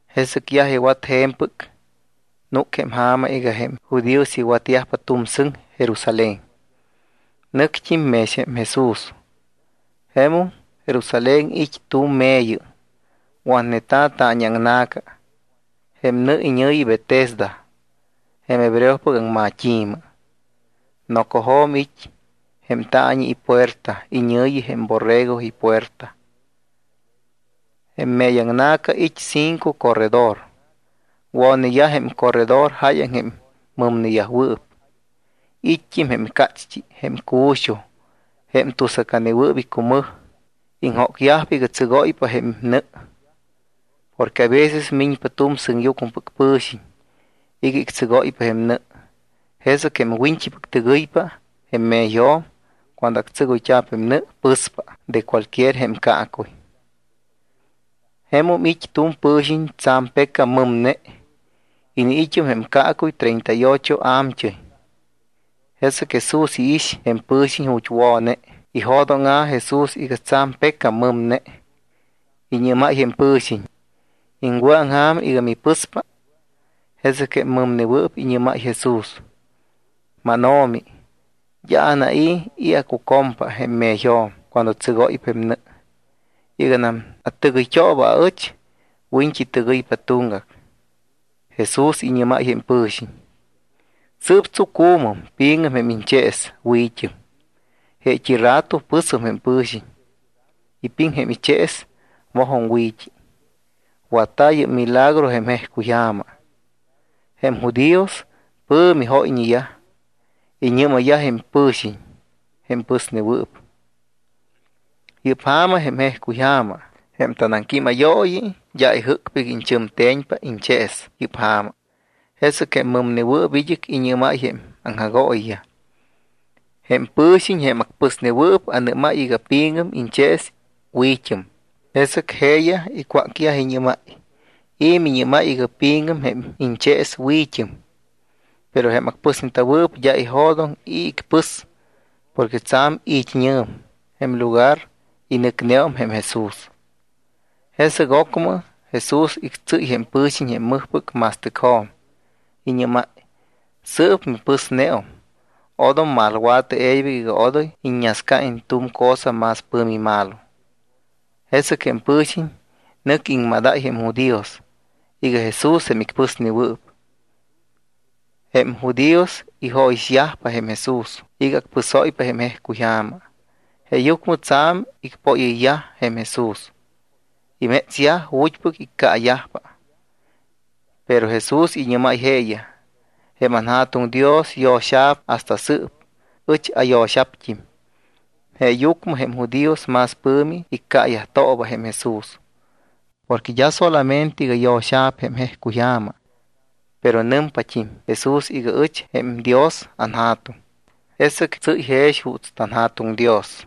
Jesɨc yaj iwat je̱mpɨc, núc jém ja̱ma iga jém judíos iwatyajpa tu̱m sɨŋ Jerusalén. Nɨct́im mex jém Jesús. Jemum Jerusalén it́ tu̱m me̱yɨ watneta̱, taañiaŋna̱ca. Jém nɨ iñɨ̱yi Betesda jém hebreopɨc aŋmat́i̱mɨ. Nocojo̱m it́ jém taañi ipuerta iñɨ̱yi jém Borrego iPuerta. Jém me̱yaŋna̱ca it́ cinco corredor. Wo̱neyaj jém corredor jáyaŋ jém mɨmneyajwɨɨp. It́t́im jém cácht́i, jém cu̱xuj y jém tusacanewɨɨp icumɨj. Iŋjócyajpa iga tsɨgóypa jém nɨ. Porque aveces miñpa tu̱m sɨŋyucmɨpɨc pɨ̱xiñ iga ictsɨgóypa jém nɨ. Jesɨc jém wiñt́ipɨc tɨgɨypa jém me̱yjo̱m cuando tsɨgóypa jém nɨ, pɨspa de cualquier jém caacuy. Jemum it́ tu̱m pɨ̱xiñ tsa̱m pecam mɨmne. Iniit́um jém caacuy treinta y ocho a̱mt́ɨy. Jesɨc Jesús iix jém pɨ̱xiñ ju̱t́ wo̱ne. Ijo̱dóŋa̱ Jesús iga tsa̱m pecam mɨmne, iñɨ́máy jém pɨ̱xiñ: —¿Iŋwɨ̱aŋja̱m iga mipɨspa? Jesɨc jém mɨmnewɨɨp iñɨ́máy Jesús: —MánO̱mi, d́a anai̱ i̱ acucompa jém me̱yjo̱m cuando tsɨgóypa jém nɨ. Iganam atɨgɨyt́ooba aɨch, wiñt́i tɨgɨypa tuŋgac. Jesús iñɨ́máy jém pɨ̱xiñ: —Sɨɨp tsucu̱mɨm, pi̱ŋɨm jém iñchees, wi̱t́ɨm. Jeet́i rato pɨsum jém pɨ̱xiñ, ipiŋ jém ichees, mojum wi̱t́i. Watta̱ yɨ́p milagro jém jejcuyja̱ma. Jém judíos pɨ̱mi jóyñeyaj. Iñɨ́mayyaj jém pɨ̱xiñ jém pɨsnewɨɨp: —Yɨ́p ja̱ma jém jejcuyja̱ma. Jém tanaŋquímayooyi d́a ijɨ́cpa iga iñchɨmte̱ñpa iñchees yɨ́p ja̱ma. Jesɨc jém mɨmnewɨɨp id́ɨc iñɨ́máy jém aŋjagooyiyaj: —Jém pɨ̱xiñ, jém acpɨsnewɨɨp, anɨ́máy iga: “Pi̱ŋɨm iñchees. Wi̱t́ɨm.” Jesɨc jeeyaj icwácyaj, iñɨ́máy: —¿I̱ miñɨ́máy iga: “Pi̱ŋɨm jém iñchees, wi̱t́ɨm”? Pero jém acpɨsneta̱wɨɨp d́a ijo̱doŋ i̱ icpɨs porque tsa̱m it́ñɨ̱m jém lugar y nɨcneum jém Jesús. Jesɨc ocmɨ Jesús ictsɨ́y jém pɨ̱xiñ jém mɨjpɨc ma̱stɨcjo̱m. Iñɨ́máy: —Sɨɨp mipɨsneum. Odom malwa̱tɨ e̱ybɨc iga odoy iññascaiñ tu̱m cosa más pɨ̱mi malo. Jesɨc jém pɨ̱xiñ nɨc iŋmadáy jém judíos iga Jesús jém icpɨsnewɨɨp. Jém judíos ijóyixyajpa Jesús iga acpɨsóypa jém jejcuyja̱ma. Jeeyucmɨ tsa̱m icpóyɨyyaj jém Jesús. Imétsyaj ju̱t́pɨc iccaayajpa. Pero Jesús iñɨ́máy jeeyaj: —Jém anJa̱tuŋ Dios yo̱xa̱p hasta sɨɨp. Ɨch ayo̱xa̱pt́im. Jeeyucmɨ jém judíos más pɨ̱mi iccaayajtooba jém Jesús. Porque d́a solamente iga yo̱xa̱p jém jejcuyja̱ma, pero nɨmpat́im Jesús iga: “Ɨch jém Dios anJa̱tuŋ.” Jesɨc tsɨ́y jex juuts tanJa̱tuŋ Dios.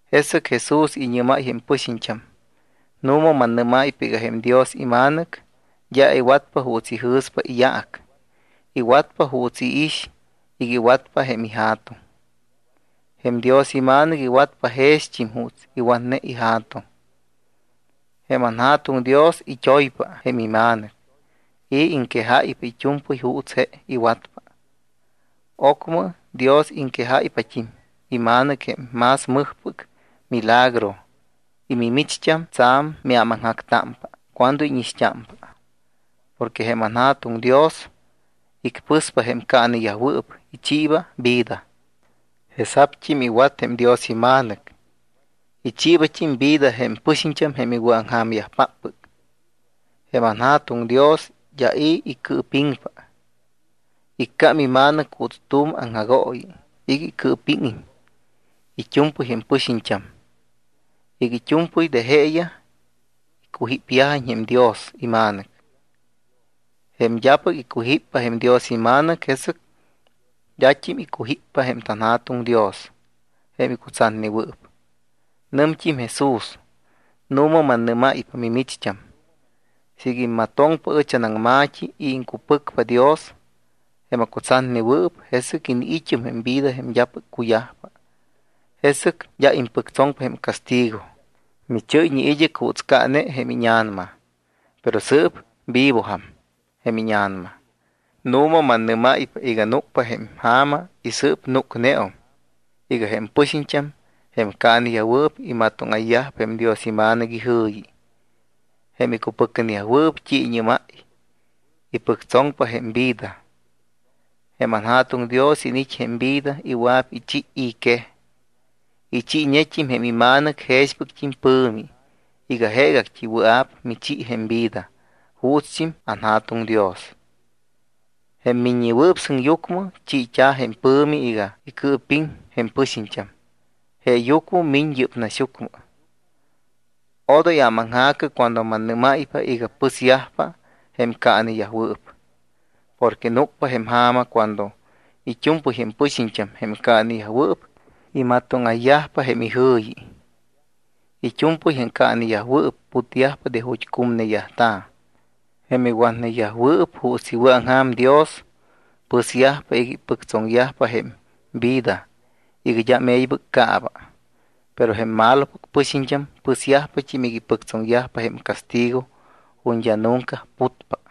Jesɨc Jesús iñɨ́máy jém pɨxiñt́am: —Nu̱ma mannɨ́máypa iga jém Dios iMa̱nɨc d́a iwatpa juuts ijɨ̱spa iyaac, iwatpa juuts iix iga iwatpa jém iJa̱tuŋ. Jém Dios iMa̱nɨc iwatpa jext́im juuts iwatne iJa̱tuŋ. Jém anJa̱tuŋ Dios it́oypa jém iMa̱nɨc y iŋquejáypa it́u̱mpɨy juuts je iwatpa. Ocmɨ Dios iŋquejáypat́im iMa̱nɨc jém más mɨjpɨc milagro y mimicht́am tsa̱m miámaŋjactámpa cuando íñixt́ámpa. Porque jém anJa̱tuŋ Dios icpɨspa jém caaneyajwɨɨp, ichiiba vida. Jesa̱pt́im iwat jém Dios iMa̱nɨc, ichiibat́im vida jém pɨxiñt́am jém iwɨ̱aŋja̱myajpáppɨc. Jém anJa̱tuŋ Dios d́a i̱ icɨɨpiŋpa. Iccám iMa̱nɨc juuts tu̱m aŋjagooyi iga icɨɨpíŋiñ it́u̱mpɨy jém pɨxiñt́am, iga it́u̱mpɨy de jeeyaj icujípyajiñ jém Dios iMa̱nɨc. Jém d́apɨc icujíppa jém Dios iMa̱nɨc, jesɨc d́at́im icujíppa jém anJa̱tuŋ Dios jém icutsatnewɨɨp. Nɨmt́im Jesús: —Nu̱ma mannɨ́máypa mimicht́am, siiga immatoŋpa ɨch anaŋma̱t́i y iŋcupɨcpa Dios jém acutsatnewɨɨp, jesɨc iniit́um jém vida jém d́apɨc cuyajpa. Jesɨc d́a impɨctsoŋpa jém castigo. Michɨ́yñe id́ɨc juuts caane jém íña̱nama, pero sɨɨp vivojam jém íña̱nama. Nu̱ma mannɨ́máypa iga núcpa jém ja̱ma y sɨɨp núcneum iga jém pɨxiñt́am, jém caaneyajwɨɨp, imatóŋayyajpa jém Dios iMa̱nɨc ijɨ̱yi. Jém icupɨcneyajwɨɨp t́i iñɨ́máy, ipɨctsoŋyajpa jém vida. Jém anJa̱tuŋ Dios iniit́ jém vida y wɨa̱p ichi i̱ quej. Ichiiñet́im jém iMa̱nɨc jexpɨct́im pɨ̱mi iga jeegact́i wɨa̱p michi jém vida juutst́im anJa̱tuŋ Dios. Jém Miññewɨɨp Sɨŋyucmɨ chiit́a̱ jém pɨ̱mi iga icɨɨpiŋ jém pɨxiñt́am. Jeeyucmɨ miñ yɨ́p naxyucmɨ. Odoy ámaŋja̱cɨ cuando mannɨ́máypa iga pɨsyajpa jém caaneyajwɨɨp. Porque núcpa jém ja̱ma cuando it́u̱mpɨy jém pɨxiñt́am, jém caaneyajwɨɨp, imatóŋayyajpa jém ijɨ̱yi. It́u̱mpɨy jém caaneyajwɨɨp putyajpa de ju̱t́ cumneyajta̱. Jém iwatneyajwɨɨp juuts iwɨ̱aŋja̱m Dios, pɨsyajpa iga ipɨctsoŋyajpa jém vida iga d́am e̱ybɨc caaba. Pero jém malopɨc pɨxiñt́am, pɨsyajpat́im iga ipɨctsoŋyajpa jém castigo ju̱t́ d́a nunca putpa.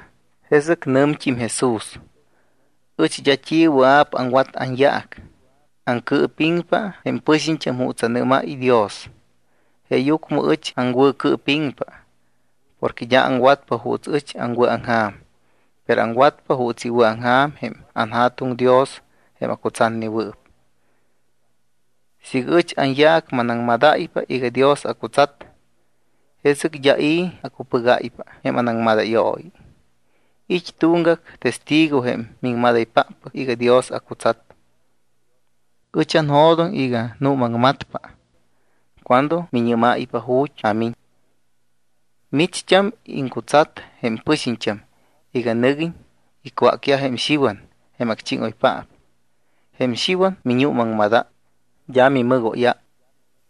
Jesɨc nɨmt́im Jesús: —Ɨch d́a t́i wɨa̱p aŋwat anyaac. Aŋcɨɨpiŋpa jém pɨxiñt́am juuts anɨ́máy Dios. Jeeyucmɨ ɨch aŋwɨ̱cɨɨpiŋpa porque d́a aŋwatpa juuts ɨch aŋwɨ̱aŋja̱m, pero aŋwatpa juuts iwɨ̱aŋja̱m jém anJa̱tuŋ Dios jém acutsatnewɨɨp. Siiga ɨch anyaac manaŋmadáypa iga Dios acutsat, jesɨc d́a i̱ acupɨgáypa jém anaŋmadayooyi. It́ tuŋgac testigo jém miŋmadaypáppɨc iga Dios acutsat. Ɨch anjo̱doŋ iga nuumaŋmatpa cuando miñɨ́máypa ju̱t́ amiñ. Micht́am iŋcutsat jém pɨxiñt́am iga nɨguiñ icwácyaj jém Xiwan jém acchíŋoypaap. Jém Xiwan miñuumaŋmadáy, d́a mimɨgóyáy.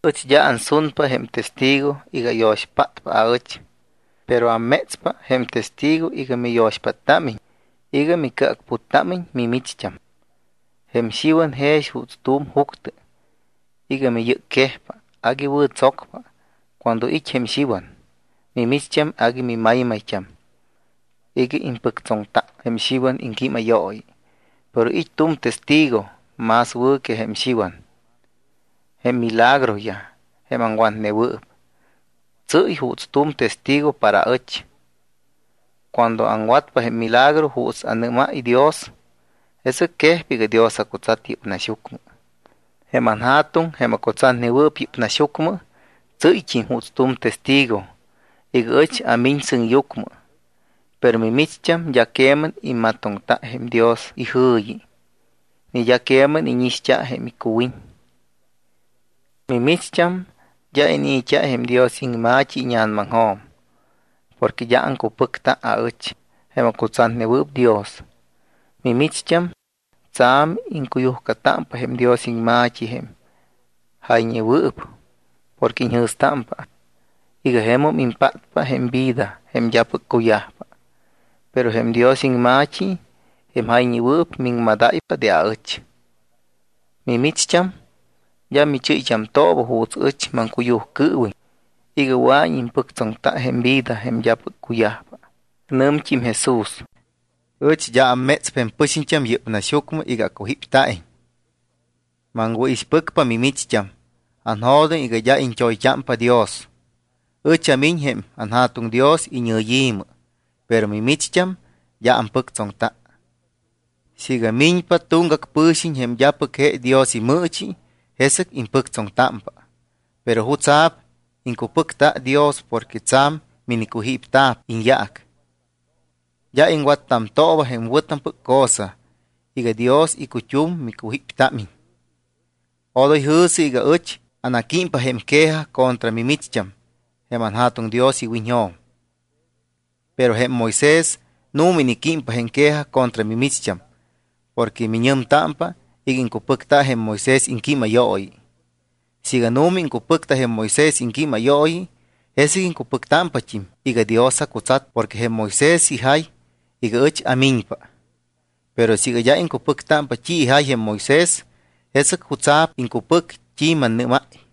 Ɨch d́a ansunpa jém testigo iga ayo̱xpátpa aɨch, pero ammétspa jém testigo iga miyo̱xpáttámiñ iga micɨacputtámiñ mimicht́am. Jém Xiwan jex juuts tu̱m juctɨ iga miyɨ́cquejpa, agui wɨ̱tsocpa. Cuando it́ jém Xiwan, mimicht́am agui mimaymayt́am iga impɨctsoŋta jém Xiwan iŋquímayooyi. Pero it́ tu̱m testigo más wɨ̱ que jém Xiwan. Jém milagroyaj, jém aŋwatnewɨɨp, tsɨ́y juuts tu̱m testigo para ɨch. Cuando aŋwatpa jém milagro juuts anɨ́máy Dios, jesɨc quejpa iga Dios acutsat yɨ́p naxyucmɨ. Jém anJa̱tuŋ, jém acutsatnewɨɨp yɨ́p naxyucmɨ, tsɨ́yt́im juuts tu̱m testigo iga ɨch amiñ sɨŋyucmɨ, pero mimicht́am d́a queman immatoŋta jém Dios ijɨ̱yi ni d́a queman íñixt́a jém icuwiñ. Mimicht́am, d́a inii̱t́a jém Dios iŋma̱t́i íña̱namaŋjo̱m porque d́a aŋcupɨcta aɨch jém acutsatnewɨɨp Dios. Mimicht́am tsa̱m iŋcuyujcatámpa jém Dios iŋma̱t́i jém jayñewɨɨp porque iñjɨ̱stámpa iga jemum impátpa jém vida jém d́apɨc cuyajpa. Pero jém Dios iŋma̱t́i jém jayñewɨɨp, miŋmadáypa de aɨch. Mimicht́am d́a michɨ́yt́amtooba juuts ɨch maŋcuyujcɨɨwiñ iga wɨa̱iñ impɨctsoŋta jém vida jém d́apɨc cuyajpa. Nɨmt́im Jesús: —Ɨch d́a ammétspa jém pɨxiñt́am yɨ́p naxyucmɨ iga acujípyajiñ. Maŋwɨ̱ixpɨcpa mimicht́am, anjo̱doŋ iga d́a iñt́oyt́ámpa Dios. Ɨch amiñ jém anJa̱tuŋ Dios iñɨyi̱mɨ, pero mimicht́am d́a ampɨctsoŋta. Siiga miñpa tuŋgac pɨ̱xiñ jém d́apɨc je Dios imɨɨchi, jesɨc impɨctsoŋtámpa. ¿Pero jutsa̱p iŋcupɨcta Dios porque tsa̱m minicujíptamta̱p iñyaac? D́a iŋwattamtooba jém wɨ̱tampɨc cosa iga Dios icut́um micujíptámiñ. Odoy jɨ̱sɨ iga ɨch anaquímpa jém quejaj contra mimicht́am jém anJa̱tuŋ Dios iwiñjo̱m. Pero jém Moisés nu̱ma iniquímpa jém quejaj contra mimicht́am porque miñɨmtámpa iga iŋcupɨcta jém Moisés iŋquímayooyi. Siiga nu̱ma iŋcupɨcta jém Moisés iŋquímayooyi, jesɨc iŋcupɨctámpat́im iga Dios acutsat porque jém Moisés ijay iga ɨch amiñpa. Pero siiga d́a iŋcupɨctámpa t́i ijay jém Moisés, ¿jesɨc jutsa̱p iŋcupɨc t́i mannɨ́máy?